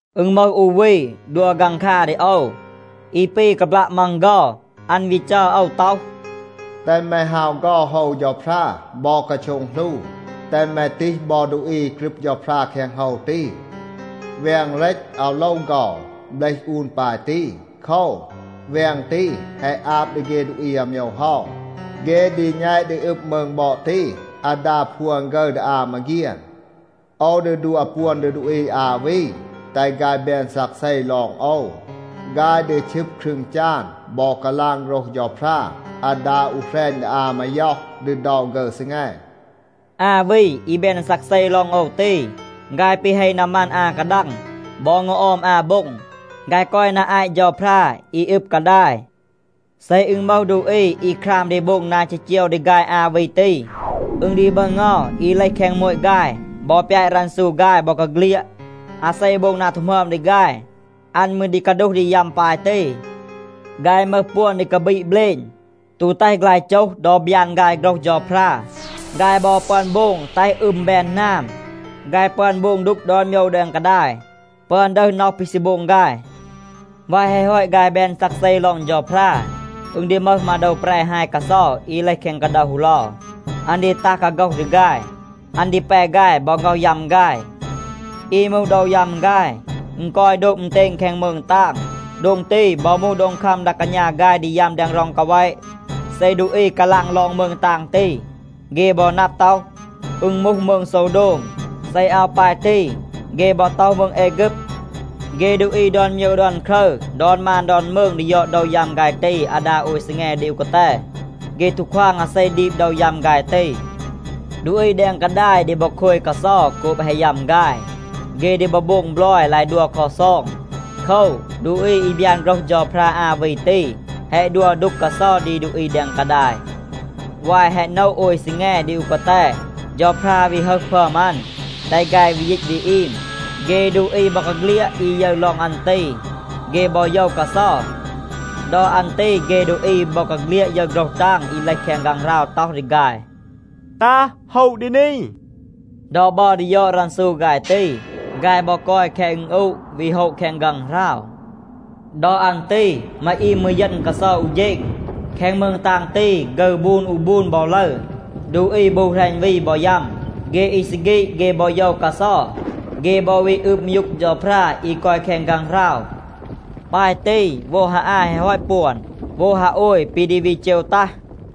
อึณ มึห อู วี ดัว ฆังคา ดี โอว. อี ปี กาบลัะ มัง เฆา. อัน วี จัร โอว ต็อห, “แตห แม ฮาว เฆา โฮว เฌาพรา บอ กาโช็ง หลู. แตห แม ตีห บอ ดูอี อี กรึบ เฌาพรา แคง โฮว ตี. แวง เรต อาว โลว เฆา, เบลห อูน ปาย ตี. โคว, แวง ตี แฮะ อาบ ดี เฆ ดูอี อาโมยว เฮา. เฆ ดี แณต ดี อึบ มืง บอด ตี อาดา พวน ฆึร ดี อา มาเฆียน. โอว ดี ดัว ปวน ดี ดูอี อา วี, แตห ฆาย แบน ซักเซ ลอง โอว. ฆาย ดี ชึบ ครึง จาน บอ กาลาง โฆรห เฌาพรา อาดา อู แหรณ ดี อา มาย็อห ดี เดา ฆึร ซีแง.” อา วี อี แบน ซักเซ ลอง โอว ตี, ฆาย ปี เฮ นามัน อา กาดัง บอ เงา ออม อา โบ็ง. ฆาย กอย นา อาต เฌาพรา อี อึบ กาดาย. เซ อึณ มึห ดูอี อี คราม ดี โบง นา จีจีว ดี ฆาย อา วี ตี, อึณ ดี มึห เงา อี เลห แคง โมต ฆาย บอ ปยาต รันซู ฆาย บอกาเฆลียด. อาเซ โบง นา ตู หมึอม ดี ฆาย, อัน มืร ดี กาดูห ดี ยัม ปาย ตี. ฆาย มึห ปวน ดี กาบีด เบลณ, ตู แตห ฆลาย โจห ดอ บยาน ฆาย โฆรห เฌาพรา. ฆาย บอ ปึอน โบง แตห อึม แบน หนาม. ฆาย ปึอน โบง ดูก ดอน โมยว แดง กาดาย, ปึอน ดึห น็อห ปี ซี โบง ฆาย. วาย แฮะ ฮอต ฆาย แบน ซักเซ ลอง เฌาพรา, อึณ ดี มึห มาโดว แปร ฮาย กาเซา อี เลห แคง กาเดา ฮูเลา. อัน ดี ตัห กาโฆห ดี ฆาย. อัน ดี แป ฆาย บอ ง็อห ยัม ฆาย. อี มูห โดว ยัม ฆาย, อึณ กอย โดบ อึณเตณ แคง มืง ตาง. โดง ตี บอ มูห โดง คัม ดา กาณา ฆาย ดี ยัม แดง ร็อง กาแวะ. เซ ดูอี กาลาง ลอง มืง ตาง ตี, เฆ บอ นับ ต็อห, อึณ มูห มืง โซวโดม. เซ อาว ปาย ตี เฆ บอ ต็อห มืง แอฆึบ. เฆ ดูอี ดอน โมยว ดอน ครึร, ดอน มาน ดอน มืง ดี ยอด โดว ยัม ฆาย ตี อาดา โอย ซีแง ดี อู กาแต. เฆ ตู ควาง อาเซ ดีบ โดว ยัม ฆาย ตี. ดูอี แดง กาดาย ดี บอ โคย กาเซา โกบ แฮะ ยัม ฆาย. เฆ ดี บอ โบง บลอย ลาย ดัว ลักซอง. โคว, ดูอี อี บยาน โฆรห เฌาพรา อา วี ตี แฮะ ดัว ดูก กาเซา ดี ดูอี แดง กาดาย. วาย แฮะ โนะ โอย ซีแง ดี อู กาแต, เฌาพรา วี ฮึห พึอม อัน, แตห ฆาย วี ยีต วี อีม. เฆ ดูอี บอกาเฆลียด อี ยึร ลอง อัน ตี, เฆ บอ โยว กาเซา. ดอ อัน ตี เฆ ดูอี บอกาเฆลียด ยึร โฆรห ตาง อี เลห แคง ฆางหราว ต็อห ดี ฆาย, “ตัห โฮะ ดี นี.” ดอ บัร ดี ยอด รันซู ฆาย ตี, ฆาย บอ กอย แคง อึณอูะ วี โฮะ แคง ฆางหราว. ดอ อัน ตี มาอีม มืร เยณ กาเซา อู เฌณ. แคง มืง ตาง ตี ฆึร บูน อู บูน บอ ลึร. ดูอี บู แหรณ วี บอ ยัม. เฆ อี ซี ฆีด, เฆ บอ โยว กาเซา. เฆ บอ วี อืบ มยูก เฌาพรา อี กอย แคง ฆางหราว. ปาย ตี โวด ฮา อา แฮะ ฮอต ปวน, โวด ฮาโอย ปี ดี วี เจว ตัห.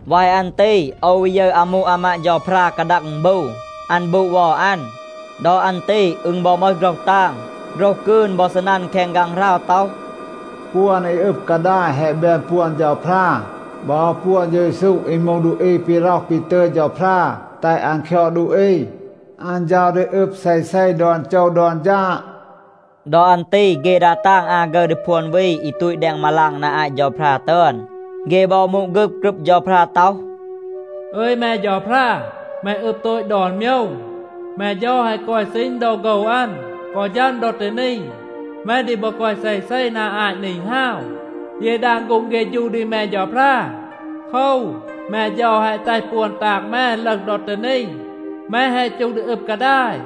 วาย อัน ตี โอว วี ยึร อามู อามาด เฌาพรา กาดัง อึณบู, อัน บูด เวา อัน. ดอ อัน ตี อึณ บอ มึห โฆรห ตาง, โฆรห กืน บอ ซีนัน แคง ฆางหราว ต็อห, “ปวน อี อึบ กาดาย แฮะ แบน ปวน เฌาพรา บอ ปวน เฌา เยซู อี มูห ดูอี ปี ร็อห ปี ตึย เฌาพรา แตห อัน คยอด ดูอี. อัน เฌา ดี อึบ เซเซ ดอน โจว ดอน ฌาด.” ดอ อัน ตี เฆ ดา ตาง อา ฆึร ดี พวน วี อี ตูต แดง มาลาง นา อาต เฌาพรา ตึอน, เฆ บอ มูด ฆึบ กรึบ เฌาพรา ต็อห, “อึย แม เฌาพรา, แม อึบ โตต ดอน โมยว. แม เฌา แฮะ กอย ซีณ ดอ โฆว อัน กอ ฌัม ดอ ตี นี. แม ดี บอ กอย เซเซ นา อาต นี ฮาว. เย ดาง ฆูง เฆฌู ดี แม เฌาพรา. โคว, แม เฌา แฮะ แตห ปวน ตาง แม ลึห ดอ ตี นี. แม แฮะ จูห ดี อึบ กาดาย.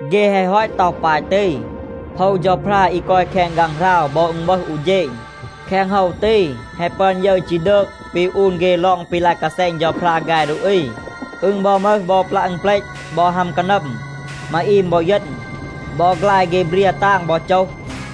เฆ แฮะ ฮอต ต็อห ปาย ตี, โฮว เฌาพรา อี กอย แคง ฆางหราว บอ อึณ วึห อู เฌณ. แคง โฮว ตี, แฮะ ปึอน ยึร ฌีดืก ปี อูน เฆ ลอง ปี ลาย กาแซณ เฌาพรา ฆาย ดูอี. อึณ บอ มึห บอ ปลัะ อึณเปลต บอ ฮัม กานัม. มาอีม บอ เยณ. บอ ฆลาย เฆ เบรีย ตาง บอ โจห.